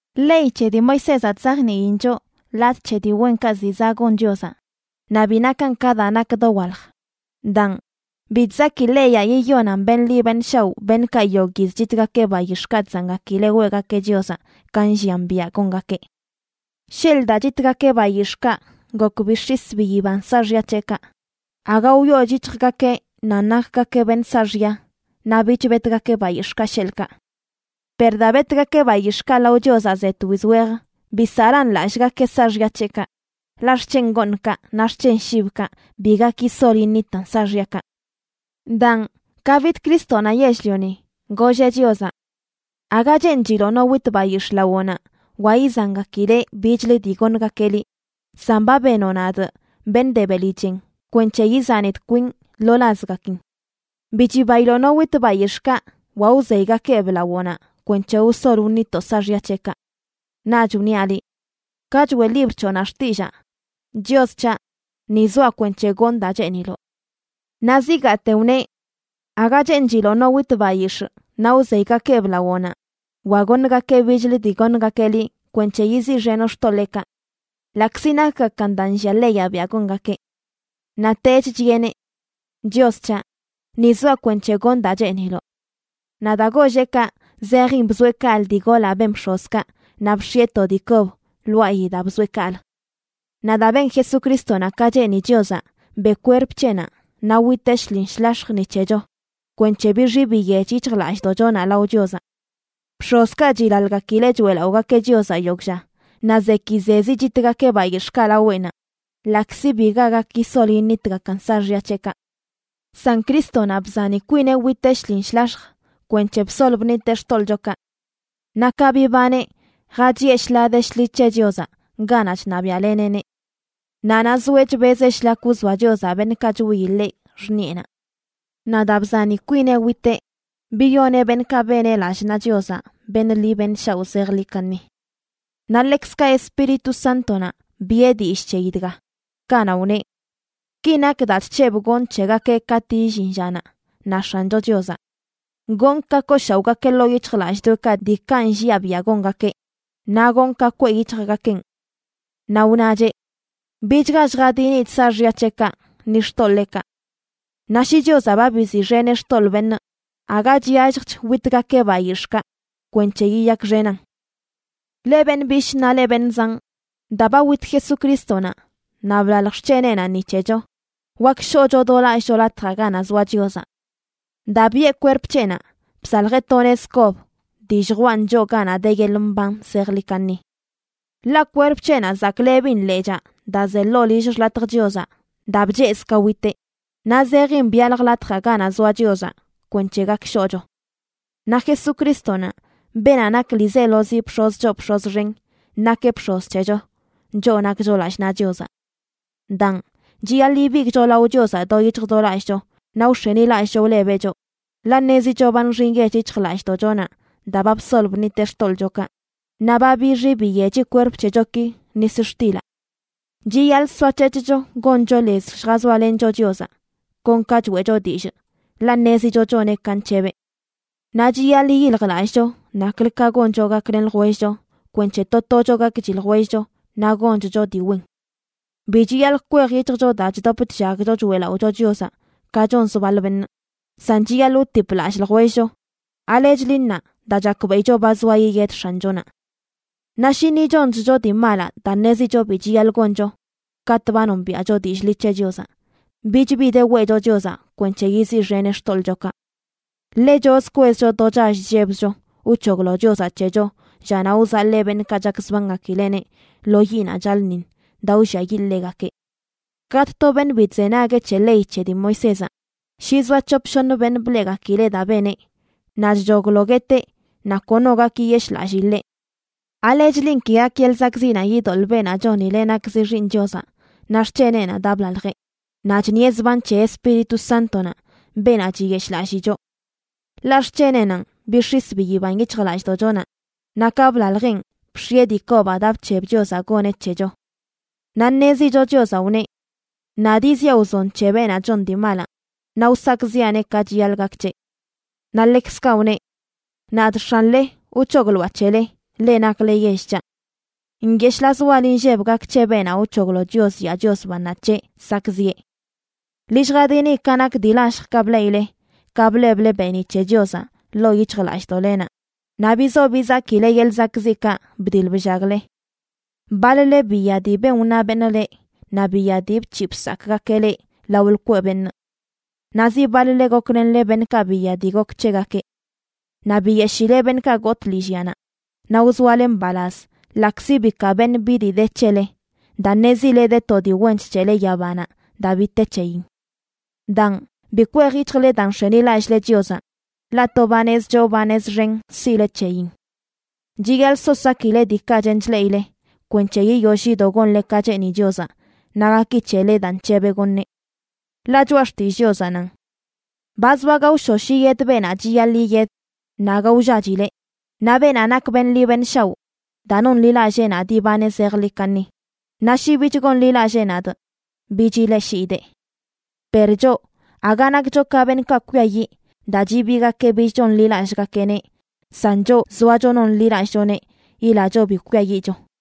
Ley c̱he dii Moisézaꞌ chzajniin choꞌ latꞌ c̱he dii wenkaꞌ ziꞌ zaꞌ gon Chiozaꞌ, naꞌ bi nakan ka daa nak dowalj. Daan, bi chzaki leyaꞌ yiyonan beṉꞌ ḻi beṉꞌ shaoꞌ beṉꞌkaꞌ yogꞌ yiz chitgakeꞌ bayix̱ꞌkaꞌ chzangakileꞌ weꞌgakeꞌ Chiozaꞌ ka nllian biaꞌ gongakeꞌ. Sheḻꞌ daa chitgakeꞌ bayix̱ꞌkaꞌ gok bix̱is biyiban saaxya c̱heꞌkaꞌ, aga wyooch yic̱hjgakeꞌ nan nakgakeꞌ beṉꞌ saaxya naꞌ bich betgakeꞌ bayix̱ꞌkaꞌ, sheḻꞌkaꞌ. Per daa betgakeꞌ bayix̱ꞌkaꞌ lao Chiozaꞌ ze twiz wej bisaꞌlan lallꞌgakeꞌ saaxya c̱heꞌkaꞌ, ḻaꞌ xc̱hen gooṉkaꞌ naꞌ xc̱hen shibkaꞌ bi gak yisol yiṉitan saaxyakaꞌ. Daan, ka bid Crístonaꞌ yell-lioni, golleꞌ Chiozaꞌ: Aga cheenchiloꞌ no wit bayix̱ꞌ lawoꞌnaꞌ wa izangakileꞌ bichlə dii goṉgakeꞌ liꞌ, san ba benoꞌ nadꞌ beṉꞌ de beli chen kwenc̱he izanidꞌ kwinꞌ lo lazgakin. Bi chibailoꞌ no wit bayix̱ꞌkaꞌ wa wzeygakeꞌb lawoꞌnaꞌ kwenc̱he wsol wṉitoꞌ saaxya c̱heꞌkaꞌ. Naꞌch wniaꞌ liꞌ: “Ka choeꞌ libr c̱hoꞌnaꞌ xtillaa, Chios c̱haꞌ, ni zoaꞌ kwenc̱he gonꞌ daa cheeniloꞌ.” Naꞌ zigaate wneꞌ: “Aga cheenchiloꞌ no wit bayix̱ꞌ naꞌ wzeygakeꞌb lawoꞌnaꞌ wa goṉgakeꞌ bichlə dii goṉgakeꞌ liꞌ kwenc̱he yiziꞌxenoꞌ xtoḻeekaꞌ”, ḻaꞌkzi nakgakan daa nllia leyaꞌ biaꞌ gongakeꞌ. Naꞌtech chiꞌeneꞌ: “Chios c̱haꞌ, ni zoaꞌ kwenc̱he gonꞌ daa cheeniloꞌ.” Naꞌ daa golleꞌ kaꞌ zejin bzoeꞌ kaꞌlə dii golaꞌ ben bx̱ozkaꞌ naꞌ bx̱ieꞌ to dii kob lwaayi daa bzoeꞌ kaꞌlə. Naꞌ daa ben Jesucrístonaꞌ ka cheeni Chiozaꞌ, beꞌ kwerp c̱heꞌnaꞌ naꞌ witeꞌ shlin shlax̱j ni c̱hecho, kwenc̱he bixi biyech yic̱hjlallꞌdoꞌchonaꞌ lao Chiozaꞌ. Bx̱ozkaꞌ chilaḻgakileꞌ choeꞌlaꞌogakeꞌ Chiozaꞌ yogꞌ lla, naꞌ zekizezi chitgakeꞌ bayix̱ꞌkaꞌ laweꞌnaꞌ, ḻaꞌkzi biga gak yisol yiṉitgakan saaxya c̱heꞌkaꞌ. San Crístonaꞌ bzani kwineꞌ witeꞌ shlin shlax̱j kwenc̱he bsol bṉiteꞌ xtoḻꞌchokaꞌ. Naꞌ ka bibaneꞌ, jachiꞌe shḻaa de shḻi c̱he Chiozaꞌ ganaꞌ chṉabiaꞌleneꞌneꞌ. Naꞌ naꞌ zoeꞌ chbezeꞌ shlak wzoa Chiozaꞌ beṉꞌkaꞌ chwiyi ḻeꞌ xṉiꞌenaꞌ. Naꞌ daa bzani kwineꞌ witeꞌ, biyoneꞌ beṉꞌkaꞌ beneꞌ lallꞌ naꞌ Chiozaꞌ beṉꞌ ḻi beṉꞌ shaoꞌ zejḻi kaṉi. Naꞌ ḻekzkaꞌ Espíritu Sántonaꞌ biꞌe dillꞌ c̱heyi dga, kanaꞌ wneꞌ: Ki nak daa chc̱hebꞌ gonꞌ c̱hegakeꞌ katꞌ illin llanaꞌ, na X̱ancho Chiozaꞌ: Gonꞌ ka kooshaoꞌgakeꞌ ḻoo yic̱hjlallꞌdoꞌekaꞌ diikaꞌ nlliaꞌ biaꞌ gongakeꞌ, naꞌ gonꞌ ka kweꞌ yic̱hjgakeꞌn. Naꞌ wnacheꞌ: Bichga lljadinidꞌ saaxya c̱heꞌkaꞌ ni xtoḻeekaꞌ. Naꞌ shi Chiozaꞌ ba biziꞌxeneꞌ xtoḻꞌ beṉꞌ, aga chyalljch witgakeꞌ bayix̱ꞌkaꞌ kwenc̱he yiyakxenan. Leꞌ beṉꞌ bishꞌ naꞌ leꞌ beṉꞌ zanꞌ, daa ba wit Jesucrístonaꞌ naꞌ blalj xc̱heneꞌnaꞌ ni c̱hecho, wak shoꞌcho do lallꞌcho Latjaꞌ Ganaꞌ Zoa Chiozaꞌ. Daa biꞌe kwerp c̱heꞌnaꞌ, bsaljeꞌ to nez kob dii lljwaꞌn choꞌ ganaꞌ de yeḻꞌ mban zejḻi kaṉi. Ḻaꞌ kwerp c̱heꞌnaꞌ zaklebin lechaa daa ze ḻoo lill xḻatj Chiozaꞌ daa bchezꞌ ka witeꞌ, naꞌ zejin byalj latjaꞌ ganaꞌ zoa Chiozaꞌ kwenc̱he gak shoꞌcho. Naꞌ Jesucrístonaꞌ, beenaꞌ nak ḻiizelozi bx̱oz choo bx̱oz xen, nakeꞌ bx̱oz c̱hecho, choꞌ nakcho lallꞌ naꞌ Chiozaꞌ. Daan, chiyaḻꞌ ibigꞌcho lao Chiozaꞌ do yic̱hj do lallꞌcho, naꞌ wx̱enilallꞌcho wlebeꞌ choꞌ, ḻaꞌ ṉezicho ba nxi nyech yic̱hjlallꞌdoꞌchonaꞌ daa ba bsol bṉiteꞌ xtoḻꞌchokaꞌ, naꞌ ba bixi biyechi kwerp c̱hechoki nis xtilaꞌ. Chiyaḻꞌ soac̱hec̱hcho goncho lez lljazoalencho Chiozaꞌ, kon ka choeꞌcho dillꞌ, ḻaꞌ ṉezicho choneꞌ ka nc̱hebeꞌ. Naꞌ chiyaḻꞌ yiyiljlallꞌcho naklə ka goncho gaklen ljwellcho kwenc̱he to tocho gakchi ljwellcho naꞌ gonchcho dii wen. Bi chiyaḻꞌ kwej yic̱hjcho daa chdop chllagcho choeꞌlaꞌocho Chiozaꞌ ka chonz baḻ beṉꞌ, san chiyaḻꞌ wtip lallꞌ ljwellcho, ¿alechli ṉaa daa chakbeꞌicho ba zoa yiyed X̱anchonaꞌ? Naꞌ shi ni chonchcho dii malaꞌ daa ṉezicho bi chiyaḻꞌ goncho katꞌ ba nombiaꞌcho dillꞌ ḻi c̱he Chiozaꞌ, bich bi de weꞌcho Chiozaꞌ kwenc̱he yiziꞌxeneꞌ xtoḻꞌchokaꞌ. Ḻechozə kwezcho do chall chllebzcho wc̱hoglo Chiozaꞌ c̱hecho llanaꞌ wzaḻee beṉꞌkaꞌ chakzbangakileꞌneꞌ lo yiꞌnaꞌ chaḻꞌṉiṉ daa wlliayiꞌ ḻegakeꞌ. Katꞌ to beṉꞌ bi chzenagueꞌ c̱he ley c̱he dii Moisézaꞌ, shi zoa c̱hop shoṉ beṉꞌ bleꞌgakileꞌ daa beneꞌ, naꞌ chchoglo gueteꞌ naꞌ kono gak yiyeshꞌlallii ḻeꞌ. ¿Alechlin ki gak yeḻꞌ zakꞌziꞌnaꞌ idoḻꞌ beenaꞌ chonileꞌ nakzi Xiiṉ Chiozaꞌ naꞌ xc̱heneꞌnaꞌ daa blaljeꞌ, naꞌ chṉieꞌ zban c̱he Espíritu Sántonaꞌ beenaꞌ chiyeshꞌlallii choꞌ? Ḻaꞌ xc̱heneꞌnanꞌ bix̱is biyiban yic̱hjlallꞌdoꞌchonaꞌ, naꞌ ka blaljeꞌn bx̱ieꞌ dii kobaꞌ daa bc̱heb Chiozaꞌ goneꞌ c̱hecho. Naꞌ ṉezicho Chiozaꞌ wneꞌ: “Nadꞌ yiziꞌa wzon c̱he beenaꞌ chon dii malaꞌ, naꞌ wsakꞌziꞌaneꞌ ka chiyaḻꞌ gak c̱heꞌ.” Naꞌ ḻekzkaꞌ wneꞌ: “Nadꞌ X̱anle wc̱hogloaꞌ c̱hele, leꞌ nakle yell c̱haꞌ.” ¡Nyeshꞌlaz wal inlleb gak c̱he beenaꞌ wc̱hoglo Chios yaa Chios bannaꞌ c̱heꞌ sakꞌziꞌe! Ḻi lljadini ka nak dii lalljkaꞌ bleꞌile ka bleble beeniꞌ c̱he Chiozaꞌ ḻoo yic̱hjlallꞌdoꞌlenaꞌ, naꞌ bizo bizakileꞌ yeḻꞌ zakꞌziꞌkaꞌ bdiḻ bllagle. Baḻ-le biya dii ben wna beṉꞌ leꞌ naꞌ biya dii bc̱hiꞌ bsakꞌgakeꞌ leꞌ lao lkweꞌ beṉꞌ. Naꞌ zi baḻ-le goklenle beṉꞌkaꞌ biya dii gok c̱hegakeꞌ. Naꞌ biyeshileꞌ beṉꞌkaꞌ gotꞌ lillyanaꞌ, naꞌ wzoale mbalaz ḻaꞌkzi bikaa beṉꞌ bi dii de c̱hele, daa ṉezile de to dii wench c̱hele yabanaꞌ daa bi te c̱heyin. Daan, bi kwej yic̱hjle daa nx̱enilallꞌle Chiozaꞌ, ḻaꞌ to banez choo banez xen siꞌle c̱heyin. Chiyaḻꞌ so sakile diikaꞌ chen chleꞌile kwenc̱he yiyoll yido gonle ka cheeni Chiozaꞌ naꞌ gaki c̱hele daa nc̱hebeꞌ goṉeꞌ. Ḻaꞌ Choꞌa Xtillꞌ Chiozaꞌ nan: Ba zoa gaoshosh yiyed beenaꞌ chiyaḻꞌ yiyed, naꞌ aga wllachileꞌ. Naꞌ beenaꞌ nak beṉꞌ ḻi beṉꞌ shaoꞌ daa nonḻilallee nadꞌ ibaneꞌ zejḻi kaṉi. Naꞌ shi bich gonḻilallee nadꞌ, bich ileꞌshiidee. Per choꞌ, aga nakcho ka beṉꞌkaꞌ kwiayiꞌ daa chibiigakeꞌ bich chonḻilallꞌgakeꞌneꞌ, san choꞌ zoacho nonḻilallꞌchoneꞌ yilacho bi kwiayiꞌcho.